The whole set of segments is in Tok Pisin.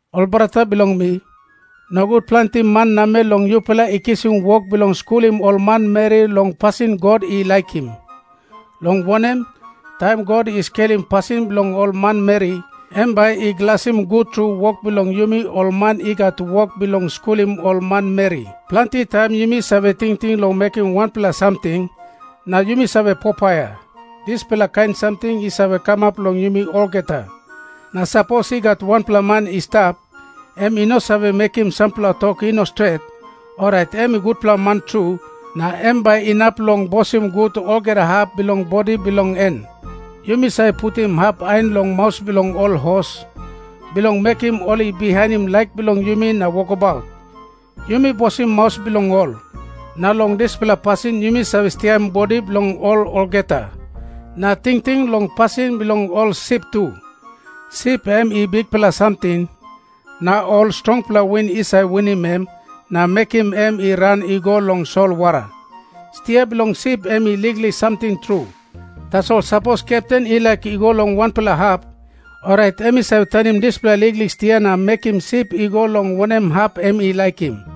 Ol brata bilong mi, nogut planti man namel long yupela i kisim wok bilong skulim ol manmeri long pasin God i laikim. Long wanem, taim God i skelim pasin bilong ol manmeri, em bai i glasim gut tru wok bilong yumi ol man i gat wok bilong skulim ol manmeri. Planti taim yumi save tingting long mekim wanpela samting, na yumi save popaia. Dispela kain samting i save kamap long yumi olgeta. Na sapos i gat wanpela man i stap, em i no save mekim sampela tok i no stret, orait em i gutpela man tru, na em bai inap long bosim gut olgeta hap bilong bodi bilong en. Yumi save putim hap ain long maus bilong ol hos, bilong mekim ol i bihainim laik bilong yumi na wokabaut. Yumi bosim maus bilong ol, na long dispela pasin yumi save stiaim bodi bilong ol olgeta. Na tingting long pasin bilong ol sip tu. Sip em i bikpela samting, na ol strongpela win i save winim em na mekim em i ran i go long solwara. Stia bilong sip em i liklik samting tru. Tasol sapos kepten i laik i go long wanpela hap, orait em i save tanim dispela liklik stia na mekim sip i go long wanem hap em i laikim.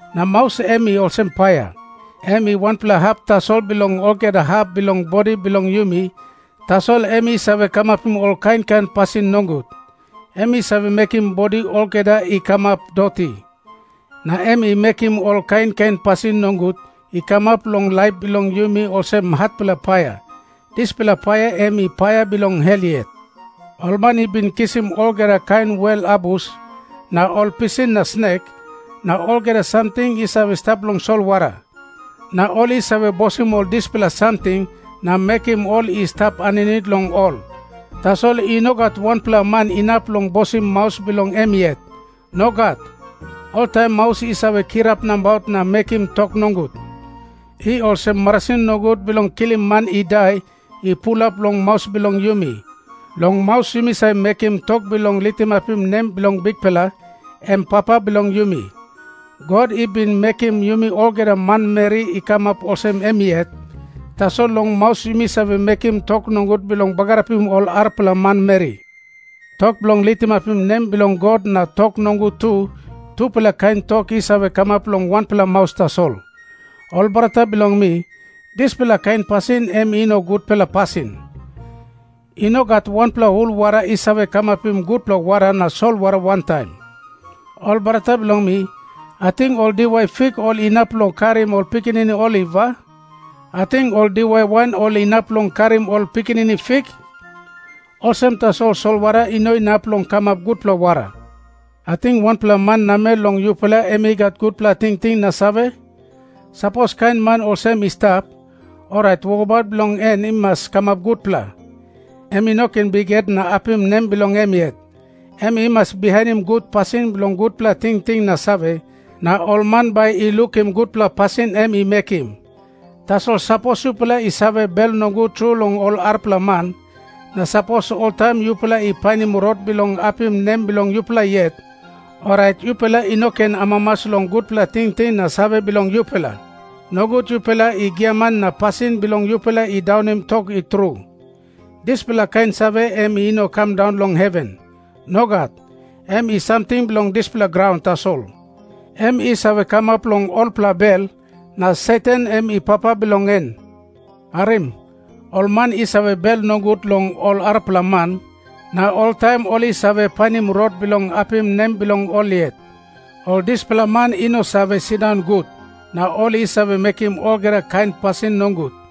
Na maus em i olsem paia. Em i wanpela hap tasol bilong olgeta hap bilong bodi bilong yumi, tasol em i save kamapim ol kain kain pasin nogut. Em i save mekim bodi olgeta i kamap doti, na em i mekim ol kain kain pasin nogut i kamap long laip bilong yumi olsem hatpela paia. Dispela paia em i paia bilong Hel yet. Ol man i bin kisim olgeta kain wel abus, na ol pisin na snek, na olgeta samting i save stap long solwara. Na ol i save bosim ol dispela samting na mekim ol i stap aninit long ol. Tasol i no gat wanpela man inap long bosim maus bilong em yet. Nogat. Oltaim maus i save kirap nabaut na mekim tok nogut. I olsem marasin nogut bilong kilim man i dai i pulap long maus bilong yumi. Long maus yumi save mekim tok bilong litimapim nem bilong Bikpela, em Papa bilong yumi. God i bin mekim yumi olgeta manmeri i kamap olsem em yet, tasol long maus yumi save mekim tok nogut bilong bagarapim ol arapela manmeri. Tok bilong litimapim nem bilong God na tok nogut tu, tupela kain tok i save kamap long wanpela maus tasol. Ol brata bilong mi, dispela kain pasin em i no gutpela pasin. I no gat wanpela hul wara i save kamapim gutpela wara na solwara wantaim. Ol brata bilong mi, ating ol diwai fik ol inap long karim ol pikinini oliv, a? Ating ol diwai wain ol inap long karim ol pikinini fik? Olsem tasol solwara i no inap long kamap gutpela wara. Ating wanpela man namel long yupela em i gat gutpela tingting na save? Sapos kain man olsem i stap, orait wokabaut bilong en i mas kamap gutpela. Em i no ken bikhet na apim nem bilong em yet. Em i mas bihainim gut pasin bilong gutpela tingting na save, na ol man bai i lukim gutpela pasin em i mekim. Tasol sapos yupela i save bel nogut tru long ol arapela man, na sapos oltaim yupela i painim rot bilong apim nem bilong yupela yet, orait yupela i no ken amamas long gutpela tingting na save bilong yupela. Nogut yupela i giaman na pasin bilong yupela i daunim tok i tru. Dispela kain save em i no kam daun long heven. Nogat. Em i samting bilong dispela graun tasol. Em i save kamap long olpela bel, na Satan em i papa bilong en. Harim. Ol man i save bel nogut long ol arapela man, na oltaim ol i save painim rot bilong apim nem bilong ol yet, ol dispela man i no save sindaun gut, na ol i save mekim olgeta kain pasin nogut.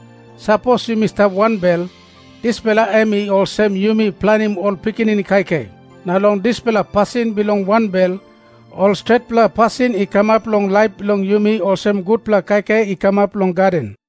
Sapos yumi stap wanbel, dispela em i olsem yumi planim ol pikinini kaikai. Na long dispela pasin bilong wanbel, ol stretpela pasin i kamap long laip bilong yumi olsem gutpela kaikai i kamap long gaden.